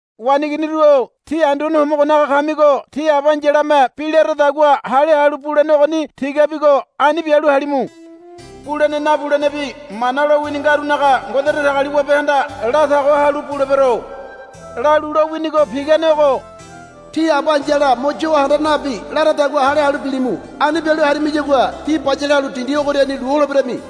Waneiginiru-o tí Anduane Homogonaga kamigo tí aba aíyalame bi laradagua hale halu bulene ogoni tigabigo ani bialu halimu. Bulene nabulenebi mana lowini ngarunaga Ngode Datagaliwabehanda la tago halu, Bulebero, lalu lowinigo pigane ogo. Tí aba ai̱yala mo yo handa nabi laradagua hale halu bilimu. Ani bialu harimiyagua tí bayale halu dindi ogoriani lu holeberami,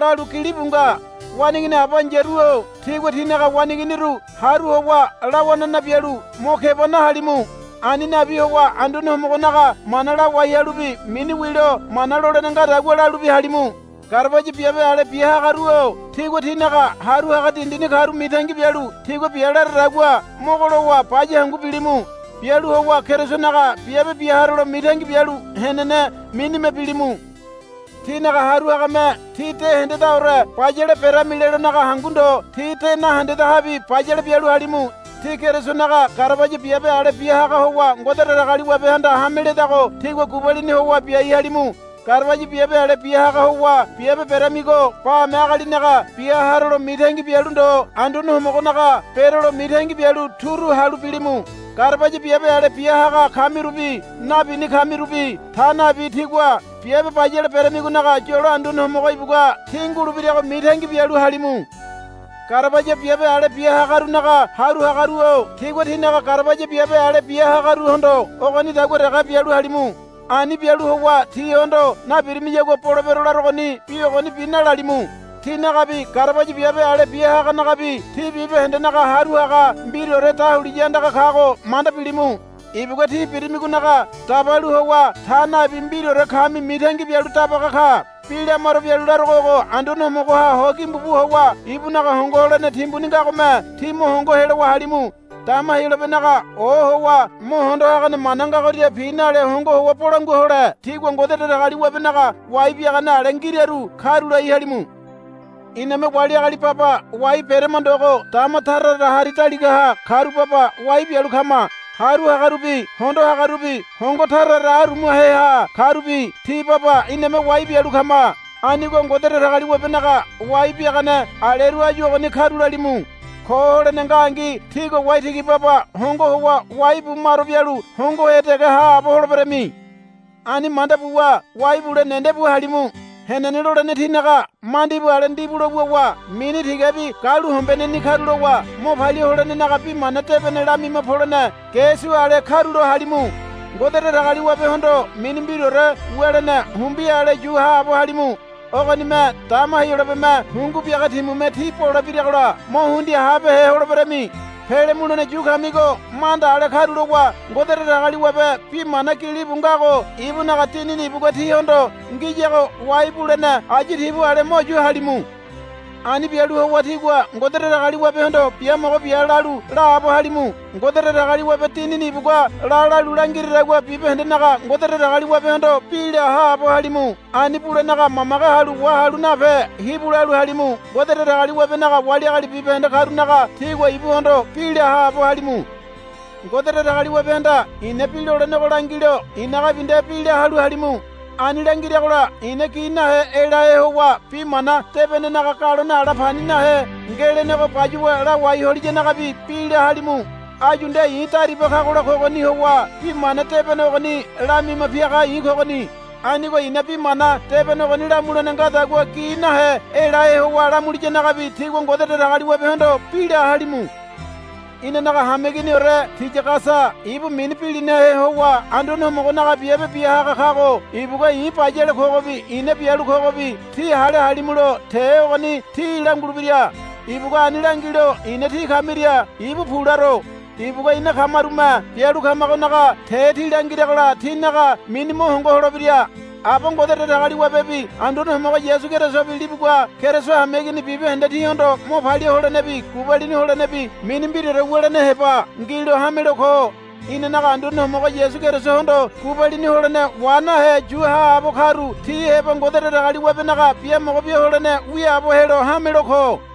lalu gilibu nga. Waneigini aba ai̱yaru-o tígua tínaga waneiginiru haru howa lawanana bialu mo keba nahalimu. Ani nabi howa Anduane Homogonaga mana lawai halubi mini wilo mana lolene ngadagua lalubi halimu. Garabaya biabe ale bia hagaru-o tígua tínaga haru haga dindini karu mitangi bialu tigua bia laradagua mogo lowa baya hangu bilimu. Bialu howa Kerisonaga biabe bia harolo mitangi bialu henene minime bilimu. Tínaga haru hagame tí de hendedaore bayale berami lelonaga hangu ndo tí de nahendedahabi bayale bialu halimu. Tí Kerisonaga garabaya biabe ale bia haga howa Ngode Datagaliwabehanda hame ledago tígua gubalini howa biai halimu. Garabaya biabe ale bia haga howa biabe beramigo bame agalinaga bia harolo mitangi bialu ndo Anduane Homogonaga berolo mitangi bialu turu halu bilimu. Garabaya biabe ale bia haga kamirubi nabini kamirubi ta nabi tígua biabe bayale beramigonaga yolo Anduane Homogo ibugua tí ngulebirago mitangi bialu halimu. Garabaya biabe ale bia hagarunaga haru hagaru-o tígua tínaga garabaya biabe ale bia hagaruhondo ogonidagua dege bialu halimu. Ani bialu howa tihondo, Nabirimiyagua bolebero larogoni, bi ogonibi nalalimu. Tinagabi garabaya biabe ale bia haganagabi tí bibahendenaga Haru Haga mbiraore dahuliya andaga kago manda bilimu. Ibugua tí birimigonaga dabalu howa ta nabi mbiraore kami mitangi bialu dabaga ka. Bi lamaro bialu larogo ogo. Anduane Homogoha ho gimbu bu howa ibunaga hongo holene timbuni ngagome tí mo hongo helowa halimu. Dama Heyolabenaga ohowa mo hondo hagane mana ngagoria pi nale hongo howa bolangua hole tígua Ngode Datagaliwabenaga wai biagane ale ngiraru karulai halimu. Iname wali agali baba wai berama ndogo dama tara tara hari daligaha karu baba wai bialu kama. Haru hagarubi hondo hagarubi hongo tara tara arumaheha karubi ti baba iname wai bialu kama. Anigo Ngode Datagaliwabenaga wai biagane aleru áyu ogoni karulalimu. Ko holene ngangi tígua waitigi baba hongo howa wai bu maro bialu hongohe dege haabo holeberami. Ani manda buwa wai bule nendebu halimu. Henene lolene tínaga mandibu ale ndibulo wuwa mini tigabi galuhombeneni karulowa mo palia holenenaga Bi Mana Debene lamima polene ge su ale karulo halimu. Ngode Datagaliwabehondo mini mbiraore wulene humbi ale yu haabo halimu. Ogonime dama Heyolabeme hungu biaga timume tí bole biragola mo hundia habehe holeberami. Pele mulene yu kamigo manda ale karulowa Ngode Datagaliwabe bi mana gilibu ngago ibunaga Dinini ibugua tíhondo ngiyago wai bulene ayu tibu ale mo yu halimu. Ani bialu howa tígua Ngode Datagaliwabehondo, Biamogo bia, lalu laabo halimu. Ngode Datagaliwabe Dinini ibugua la lalu langiradagua bibahendenaga Ngode Datagaliwabehondo bi la haabo halimu. Ani bulenaga mamage halu wahalu nape hibu lalu halimu. Ngode Datagaliwabenaga wali agali bibahende karunaga tígua ibuhondo bi la haabo halimu. Ngode Datagaliwabehanda i̱na bi lolenego langilo i̱nagabi nde bi la halu halimu. Ani langiragola i̱na gi nahe elahe howa bi mana debenenaga galone ala pani nahe ngelenego bayuwa lawai holiyanagabi bi la halimu. Áyu nde i̱ dariba kagola kogoni howa bi mana debene ogoni lamima piaga i̱ kogoni. Anigo i̱na bi mana debene ogoni lamulene ngadagua gi nahe elahe howa lamuliyanagabi tígua Ngode Datagaliwabehondo bi la halimu. Inanaga hameiginiore Tiyagasa ibu mini bilinahe howa Anduane Homogonaga biabe bia haga kago ibugua i̱ bayale kogobi i̱na bialu kogobi tí hale halimulo te ogoni tí langulebira. Ibugua ani langilo i̱na tí kamiria ibu pu laro. Ibugua ina kamarume bialu kamagonaga te tí langiragola tínaga mini mo hongo holebira. Aba Ngode Datagaliwabebi Anduane Homogo Yasu Kerisobi libugua Keriso hameigini bibahende tíhondo mo palia holenebi gubalini holenebi mini mbiraore wulene heba ngilo hamelo ko. Inanaga Anduane Homogo Yasu Kerisohondo gubalini holene wa nahe yu haabo karu tí heba Ngode Datagaliwabenaga biamogo bia holene wiaabo helo hamelo ko.